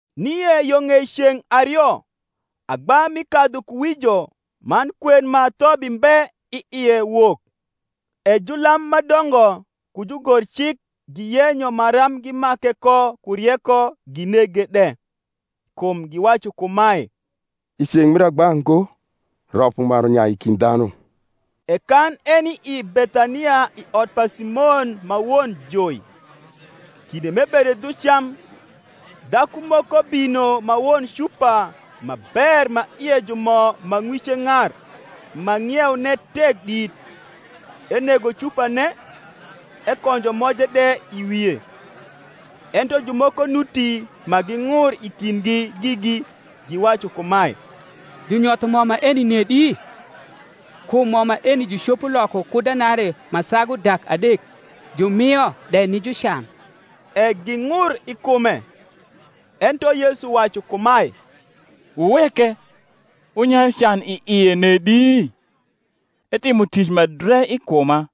Nie yo ng’ei ceng’ ario agba mi kadhukuwijo man kwen ma thobi mbe i ie wok: e julam ma dongo ku jugorcik giyenyo maram gimake ko ku rieko, ginege de: kum giwacu kumae, I ceng’ mir agba ngo, rop umaru nyai i kind dhanu. E kan eni i Bethania i ot pa Simon ma won joi, kinde m’ebedo dhu cam, dhaku moko bino ma won cupa ma ber ma ie ju mo ma ng’wice ng’ar ma ng’ieune tek dit; enego cupane, ekonjo moje de i wie. Ento jumoko nuti ma ging’ur i kindgi gigi, giwacu kumae, Junyotho mo maeni nedi? Kum mo maeni jucopo loko ku denarii ma sagu dak adek, jumio de ni jucan. E ging’ur i kume. Ento Yesu wacu kumae, Wuweke; wunyayu can i ie nedi? etimo tic ma dre i kuma.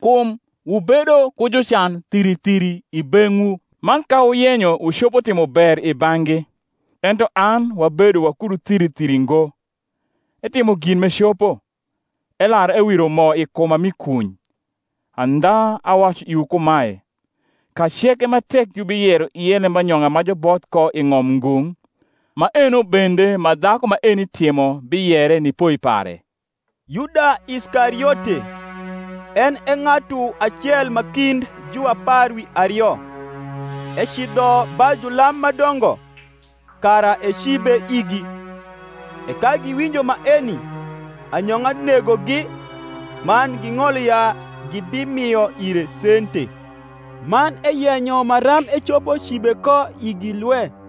Kum wubedo ku jucan thiri thiri i beng’wu, man ka wuyenyo wucopo timo ber i bang’gi: ento an wabedo wakudu thiri thiri ngo. Etimo gin m’ecopo: elar ewiro mo i kuma mi kuny. Andha awacu iwu kumae, Ka ceke ma tek jubiyero ie lembanyong’a ma juboth ko i ng’om ngung’, maeno bende ma dhaku maeni timo biyere ni poi pare. Yuda Iskariote, cn e ng’atu acel ma kind juapar wi ario, ecidho ba julam ma dongo, kara ecibe igi. E ka giwinjo maeni, anyong’a negogi, man ging’olo ya gibimio ire sente. Man eyeuyo maram ecopo cibe ko igi lwe.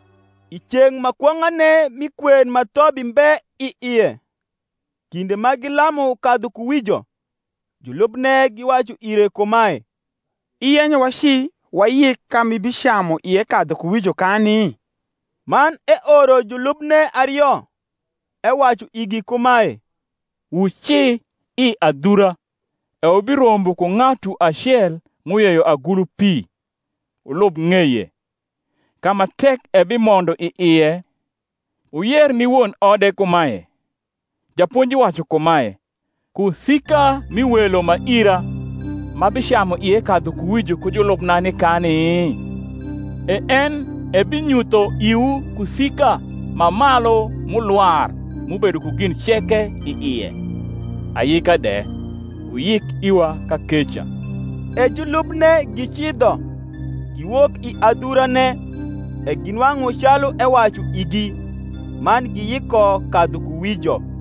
I ceng’ ma kwong’ane mi kwen ma thobi mbe i ie, kinde ma gilamu kadhukuwijo, julubne giwacu ire kumae, Iyenyo waci wayik ka m’ibicamu ie kadhukuwijo kani? Man eoro julubne ario, ewacu igi kumae, Wuci i adhura, e wubirombo ku ng’atu acel m’uyeyo agulu pi: wulub ng’eye; ka ma tek ebimondo i ie, wuyer ni won ode kumae, Japonji wacu kumae, Kusika mi welo ma ira, m’abicamu ie kadhukuwijo ku julubna, nikani? E en ebinyutho iwu kusika ma malu m’ulwar m’ubedo ku gin ceke i ie, ayika de: wuyik iwa kakeca. E julubne gicidho, giwok i adhurane, e ginwang’u calu ewacu igi: man giyiko kadhukuwijo.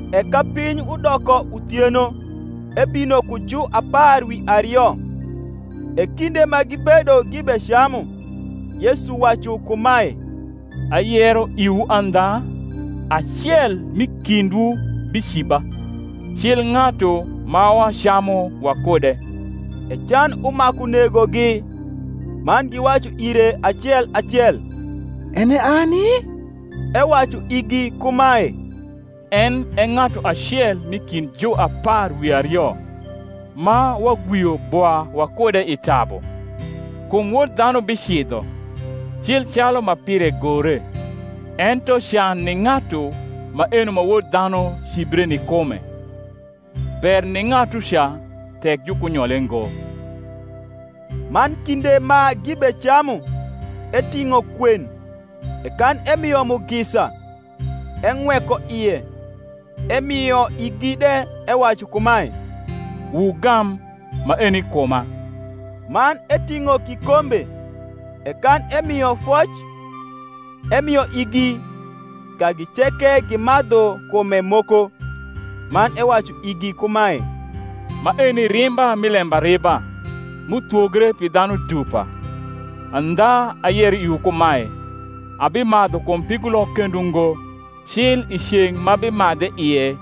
E ka piny udoko uthieno ebino ku juapar wi ario. E kinde ma gibedo gibecamu, Yesu wacu kumae, Ayero iwu andha, Acel m’i kindwu biciba, cil ng’atu ma wacamu wakude. E can umaku negogi, man giwacu ire acel acel, En e ani? Ewacu igi kumae, En e ng’atu acel m’i kind juapar wi ario, ma wagwio bwa wakude i tabu. Kum Wod dhanu bicidho. cil calu ma nire gore: ento can ni ng’atu maeno ma Wod dhanu cibre ni kume! ber ni ng’atuca tek jukunyole ngo. Man kinde ma gibecamu, eting’o kwen, e kan emio mugisa, eng’weko ie, emio igi de, ewacu kumae, Wugam: maeni kuma. Man eting’o kikombe, e kan emio foc, emio igi: kagi ceke gimadhu kume moko. Man ewacu igi kumae, Maeni rimba mi lembariba, m’uthwogre pi dhanu dupa. Andha ayero iwu kumae, Abimadhu kum pigulok kendo ngo, cil i ceng’ m’abimadhe ie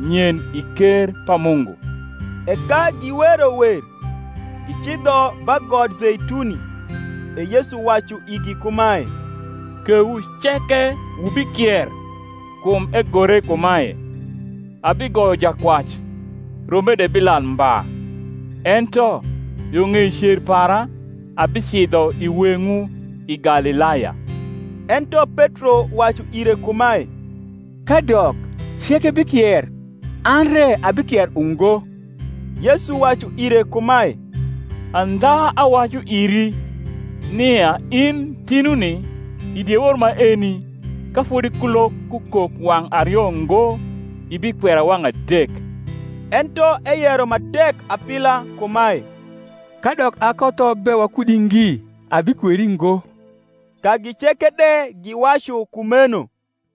nyen i ker pa Mungu. E ka giwero wer, gicidho ba got Zeituni. E Yesu wacu igi kumae, Kewu ceke wubikier: kum egore kumae, Abigoyo jakwac, rombe de bilal mba. Ento, yo ng’ei cer para, abicidho i weng’wu i Galilaya. Ento Petro wacu ire kumae, Kadok ceke bikier, an re abikier ungo. Yesu wacu ire kumae, Andha awacu iri, nia in tinuni, i diewor maeni, ka fodi kulok kukok wang’ ario ngo, ibikwera wang’ adek. Ento eyero ma tek apila kumae, Kadok akotho be wakudi ngi, abikweri ngo. Kagi ceke de giwacu kumeno.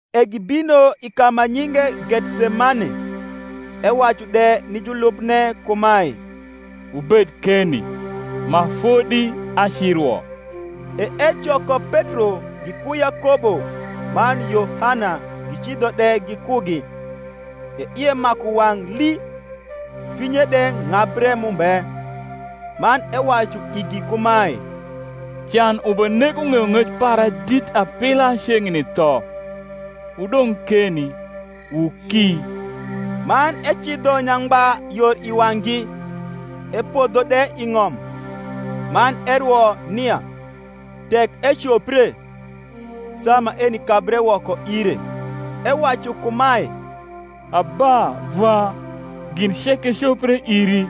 E gibino i ka ma nyinge Gethsemane: ewacu de ni julubne kumae, Wubed keni, ma fodi acirwo. E ecoko Petro giku Yakobo man Yohana gicidho de gikugi, e ie maku wang’ lii, cwinye de ng’abre mumbe. Man ewacu igi kumae, Can ubenego ng’eyong’ec para dit apila ceng’ni tho: wudong’ keni, wuki. Man ecidho nyangba yor i wang’gi, epodho de i ng’om, man erwo nia, tek ecopre, saa maeni kabre woko ire. Ewacu kumae, Abba, Vwa, gin ceke copre iri;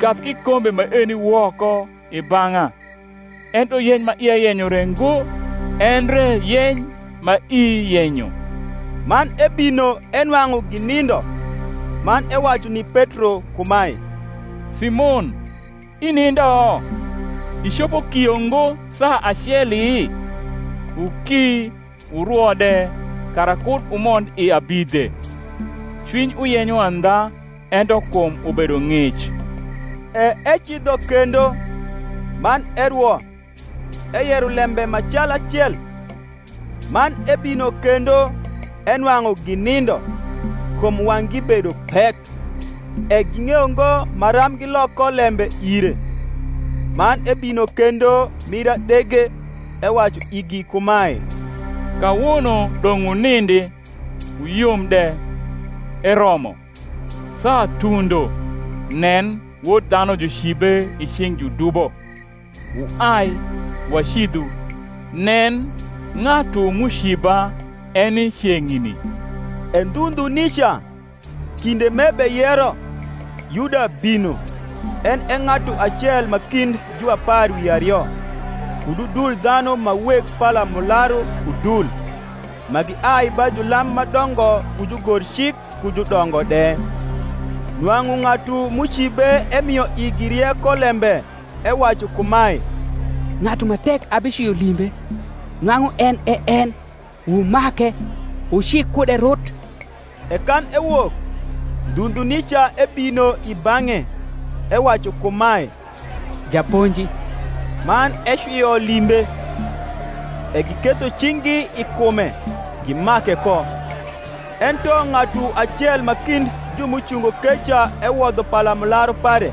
kab kikombe maeni woko i bang’a: ento yeny ma ia yenyo re ngo, endre yeny ma ii yenyo. Man ebino, enwaug’u ginindo, man ewacu ni Petro kumae, Simon, inindo? icopo kio ngo saa aceli? Wuki wurwo de, kara kud wumond i abidhe: cwiny uyenyo andha, ento kum ubedo ng’ic. E ecidho kendo, man erwo, eyero lembe ma cal acel. Man ebino kendo, enwang’u ginindo, kum wang’gi bedo pek; e ging’eyo ngo maram gilok ko lembe ire. Man ebino kendo mir adege, ewacu igi kumae, Kawono dong’ wunindi, wuyom de: eromo; saa tundo; nen, Wod dhanu jucibe i cing’ judubo. Wuai, wacidhu: nen, ng’atu m’uciba eni ceng’ni. E ndhu ndhu nica, kinde m’ebeyero, Yuda bino, en e ng’atu acel ma kind juapar wi ario, kud udul dhanu ma weg palamularu ku dul, ma giai ba julam ma dongo ku jugorcik ku judongo de. Nwang’u ng’atu m’ucibe emio igi riekolembe, ewacu kumae, Ng’atu ma tek abicwio limbe, nwang’u en e en; wumake, wuci kude rut. E kan ewok, ndhu ndhu nica ebino i bang’e, ewacu kumae, Japonji; man ecwio limbe. E giketho cing’gi i kume, gimake ko. Ento ng’atu acel ma kind ju m’ucungo keca ewodho palamularu pare,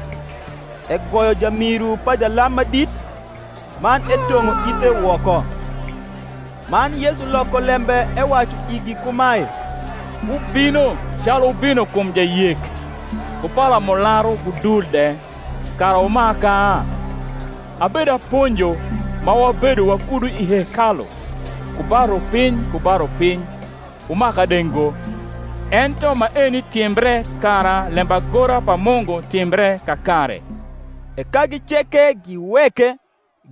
egoyo jamiru pa jalam ma dit, man etong’o ithe woko. Man Yesu loko lembe ewacu igi kumae, Wubino, calu wubino kum jayek, ku palamularu ku dul de kara wumaka? Abedaponjo ma wabedo wakudu i hekalu ku ba rupiny ku ba rupiny, wumaka de ngo: ento maeni timbre kara lembagora pa Mungu timbre kakare. E kagi ceke giweke,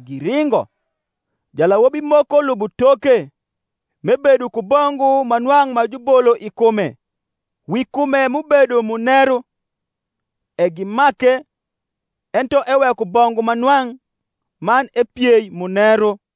giringo. Jalawobi moko lubo toke, m’ebedo ku bongu ma nwang’ ma jubolo i kume, wi kume m’ubedo muneru: e gimake; ento eweko bongu ma nwang’, man epiei muneru.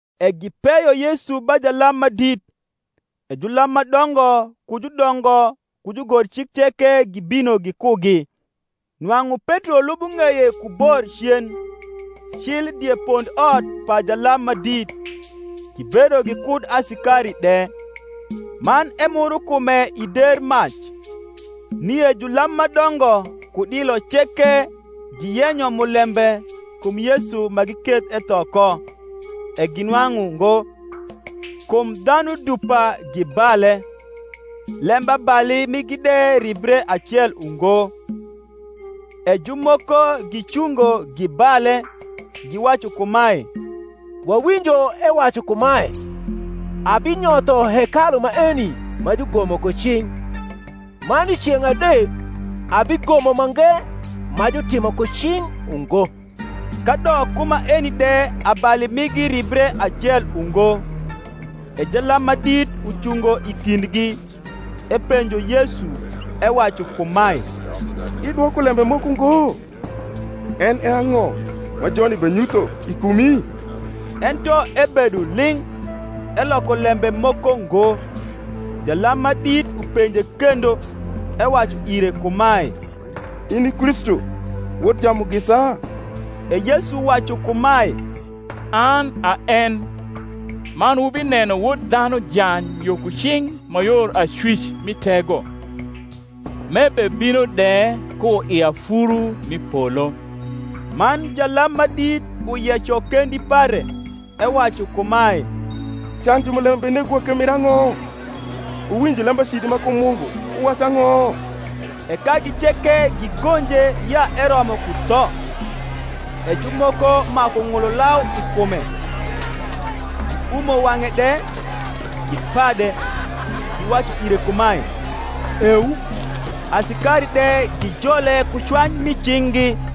E gipeyo Yesu ba jalam ma dit: e julam ma dongo ku judongo ku jugorcik ceke gibino gikugi. Nwang’u Petro lubo ng’eye ku bor cen, cil die pondot pa jalam ma dit; gibedo gikud asikari de, man emuro kume i der mac. Nie julam ma dongo ku dilo ceke giyenyo mulembe kum Yesu ma giketh etho ko; e ginwang’u ngo. Kum dhanu dupa gibale, lembabali migi de ribre acel ungo. E jumoko gicungo, gibale, giwacu kumae, Wawinjo ewacu kumae, Abinyotho hekalu maeni ma jugomo ku cing’, man i ceng’ adek abigomo mange ma jutimo ku cing’ ungo. Kadok ku maeni de abali migi ribre acel ungo. E jalam ma dit ucungo i kindgi, epenjo Yesu, ewacu kumae, Idwoko lembe moko ngo? en e ang’o ma joni benyutho i kumi? Ento ebedo ling’, eloko lembe moko ngo. Jalam ma dit upenje kendo, ewacu ire kumae, In i Kristu, Wod Jamugisa? E Yesu wacu kumae, An a en: man wubineno Wod dhanu jany yo ku cing’ ma yor acwic mi Tego, m’ebebino de ku i afuru mi polo. Man jalam ma dit uyeco kendi pare, ewacu kumae, Can jumulembe benegowa ke mir ang’o? Wuwinjo lembacidi ma kum Mungu: wuwacu ang’o? E kagi ceke gigonje ya eromo ku tho. E jumoko maku ng’ulo lau i kume, giumo wang’e de, gipade, giwacu ire kumae, Eu: asikari de gijole ku cwany mi cing’gi.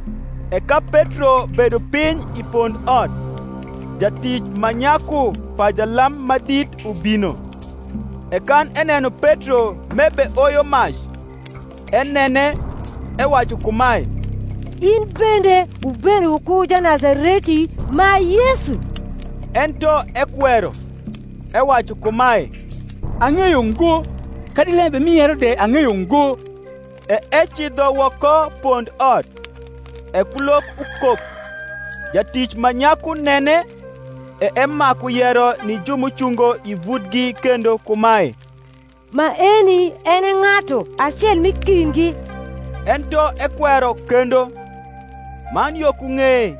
E ka Petro bedo piny i pondot, jatic ma nyaku pa jalam ma drt ubino; e kan eneno Petro m’ebeoyo mac, enene, ewacu kumae, In bende wubedo wuku Janazareti, ma Yesu. Ento ekwero, ewacu kumae, Ang’eyo ngo, kadi lembe m’iyero de ang’eyo ngo: e ecidho woko pondot; e kulok ukok. Jatic ma nyaku nene, e emaku yero ni ju m’ucungo i vutgi kendo kumae, Maeni en e ng’atu acel m’i kindgi. Ento ekwero kendo. Man yo ku ng’eye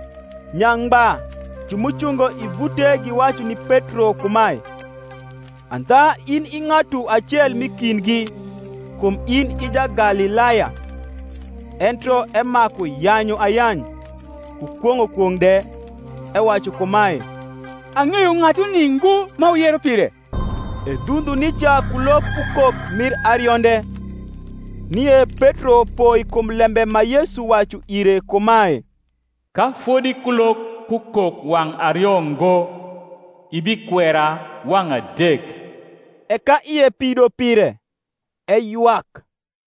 nyangba ju m’ucungo i vute giwacu ni Petro kumae, Andha in i ng’atu acel m’i kindgi; kum in i Jagalilaya. Ento emaku yanyu ayany, ku kwong’o kwong’ de, ewacu kumae, Ang’eyo ng’atuni ngo ma wuyero pire. E ndhu ndhu nica kulok ukok mir arionde. Nie Petro poi kum lembe ma Yesu wacu ire kumae, Ka fodi kulok kukok wang’ ario ngo, ibikwera wang’ adek. E ka ie pido pire, eywak.